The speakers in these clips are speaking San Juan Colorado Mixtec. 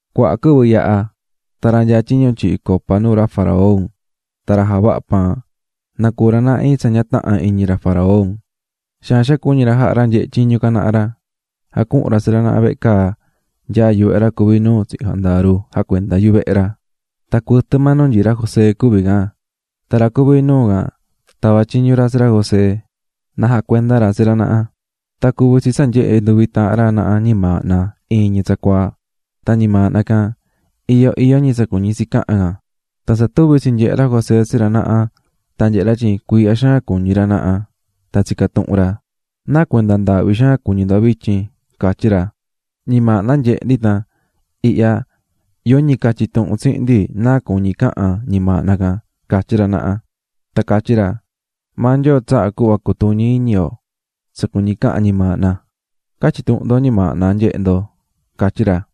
Cuaha quɨvɨ yaha̱, tan ra nyaá tyiñu tyihí copa nuu ra faraón tan ra javahá paan, nacuu̱ ra naha iin tsa ña taha̱n iñi ra faraón. Xaan xaan cuñi̱ ra jaha̱ ra nyehé tyiñu can naha ra, jacuhu̱n ra tsi ra naha vehe caa nyaá yuvehe ra cuví nuu tsihin jandaru jacuendá yuvehe ra, tan cuɨtɨ maa nu nyií ra José cuví can. Tan ra cuví nuu can tava̱ tyiñu ra tsi ra José na jacuenda ra tsi ra naha. Tan cuvi̱ tsi tsa nyehe̱ nduvi taahan ra naha ñimaahna iin ñi tsacuaa, tan ñimaahna can iyó iyó ñi tsa cuñí tsi cahan can. Tan tsa tuvi̱ tsinyehe̱ ra José tsi ra naha tan nyehe̱ ra tyin cuiihya xaan cuñí ra naha. Tan tsica̱ tuhun ra: --¿Náa cuenda ndaahvi xaan cuñí ndo vityin? --catyí ra. --Ñimaahna nyehe̱ ndi tan ihya yoñi catyi tuhun tsihin ndi náa cuñí cahan ñimaahna can --catyí ra naha. Tan catyí ra: --Maa Nyoo tsahá cuhva cutuñi iñi yo tsa cuñí cahan ñimaahna. Ca̱tyi tuhun ndo ñimaahna nyehe̱ ndo --catyí ra.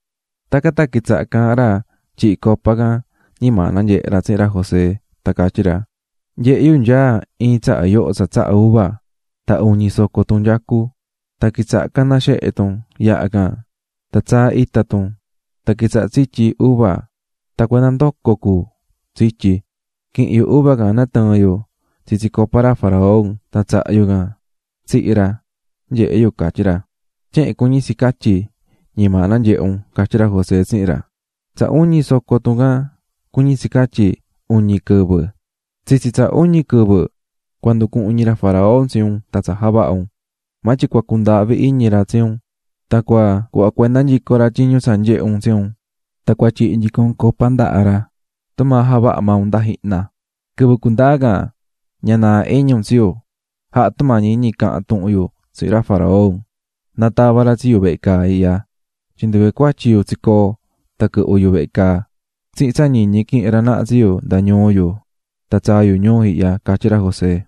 Tacan tan quitsaha̱ caahán ra tyihi̱ copa can ñimaahna nyehe̱ ra tsihin ra José, tan catyí ra: --Nyehe̱ yu nyaá iin tsaha yoho tsa tsahá uva, tan uñi soco tun nyacú. Tan quitsaha̱ caná xehe tun, yaha can tan tsaá ita tun, tan quitsahá tsityí uva tan cuenda ndoco cu tsityí. Quihi̱n yu uva can natɨɨ̱n yu tsitsi copa ra faraón tan tsaha̱ yu can tsihi̱ ra, nyehe̱ yu --catyí ra. ―Tyehen cuñí tsi catyi ñimaahna nyehe̱ un --catyí ra José tsihin ra―. Tsa uñi soco tun can cuñí tsi catyi, uñi quɨvɨ. Tsitsi tsa uñi quɨvɨ, cua nducuhun iñi ra faraón tsi un tan tsa javaha̱ un, maa tyin cua cundaahvi iñi ra tsi un tan cua cuhva cuenda nyico ra tyiñu tsa nyehe̱ un tsi un, tan cua tyihi nyico un copa ndaha ra tumaa javaha̱ maa un nda jihna. Quɨvɨ cundaa can, ña naa iñi un tsi yu, ja̱ha tumañi iñi ca̱han tuhun yu tsihin ra faraón, na tava ra tsi yu vehe caa ihya. Tyin nduve cuatyi yu tsicoo̱ tan quɨhvɨ̱ yu vehe caa, tsihin tsa ñiñi quihi̱n ra naha tsi yu nda ñuu yu tan tsaa̱ yu ñuu ihya ―catyí ra José.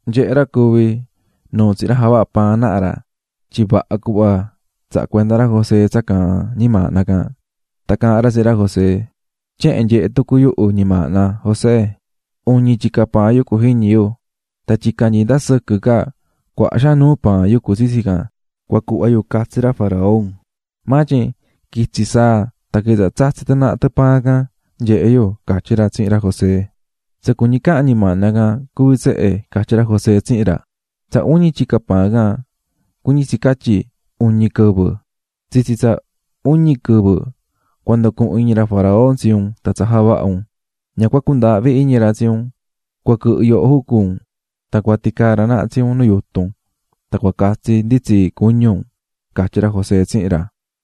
Nyehe̱ ra cuvi̱ nuu tsihin ra javahá paan naha ra tyin vaha cuhva tsaha̱ cuenda ra José tsa caahán ñimaahna can, tan caahán ra tsihin ra José: --Tyehen nyehe̱ tucu yuhu ñimaahna, José. Uñi tyica paan yucú jiñi yu. Tan tyica nyií nda sɨquɨ ca cuaha xaan nuu paan yucú tsitsi can cua cuhva yu catsi ra faraón, maa tyin quitsi̱ saa tan quitsaha̱ tsatsí tɨ naha tɨ paan can, nyehe̱ yu --catyí ra tsihin ra José. ―Tsa cuñí cahan ñimaahna can cuví tsehe --catyí ra José tsihin ra--. Tsa uñi tyica paan can cuñí tsi catyi uñi quɨvɨ. Tsitsi tsa uñi quɨvɨ cua nducuhun iñi ra faraón tsi un tan tsa javaha̱ un, ña cua cundaahvi iñi ra tsi un, cua quɨhɨ yoho jucu un tan cua ticaa ra naha tsi un nu yutun, tan cua catsi nditsii cuñu un --catyí ra José tsihin ra.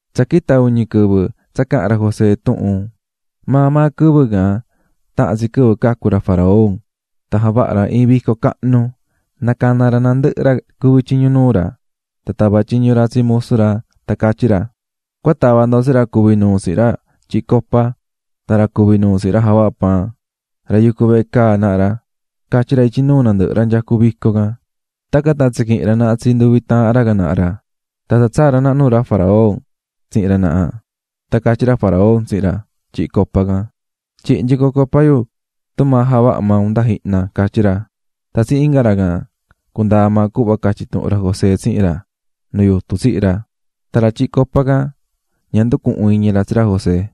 Tsa quita̱ uñi quɨvɨ tsa caha̱n ra José tuhun, maa maa quɨvɨ can taha̱n tsi quɨvɨ cacu̱ ra faraón tan javaha̱ ra iin vico cahnu, nacana̱ ra nandɨhɨ ra cuví tyiñu nuu ra. Tan tava̱ tyiñu ra tsi musu ra tan catyí ra: ―Cua ta̱va ndo tsi ra cuvi̱ nuu tsihin ra tyihí copa tan ra cuvi̱ nuu tsihin ra javahá paan, ra yucú vehe caa naha ra ―catyí ra ityi nuu nandɨhɨ ra nyacú vico can. Tacan tan tsiquihi̱n ra naha tsi nduvi taahan ra can naha ra, tan tsaa̱ ra naha nuu ra faraón tsihin ra naha, tan catyí ra faraón tsihin ra tyihi̱ copa can: ―Tyi̱hi nyico copa yu tumaa javaha̱ maa un nda jihna ―catyí ra. Tan tsihin inga ra can, cundaa̱ maa cuhva catyi̱ tuhun ra José tsihin ra, nu yutun tsihi̱ ra. Tan ra tyihí copa can ña nducuhu̱n iñi ra tsi ra José.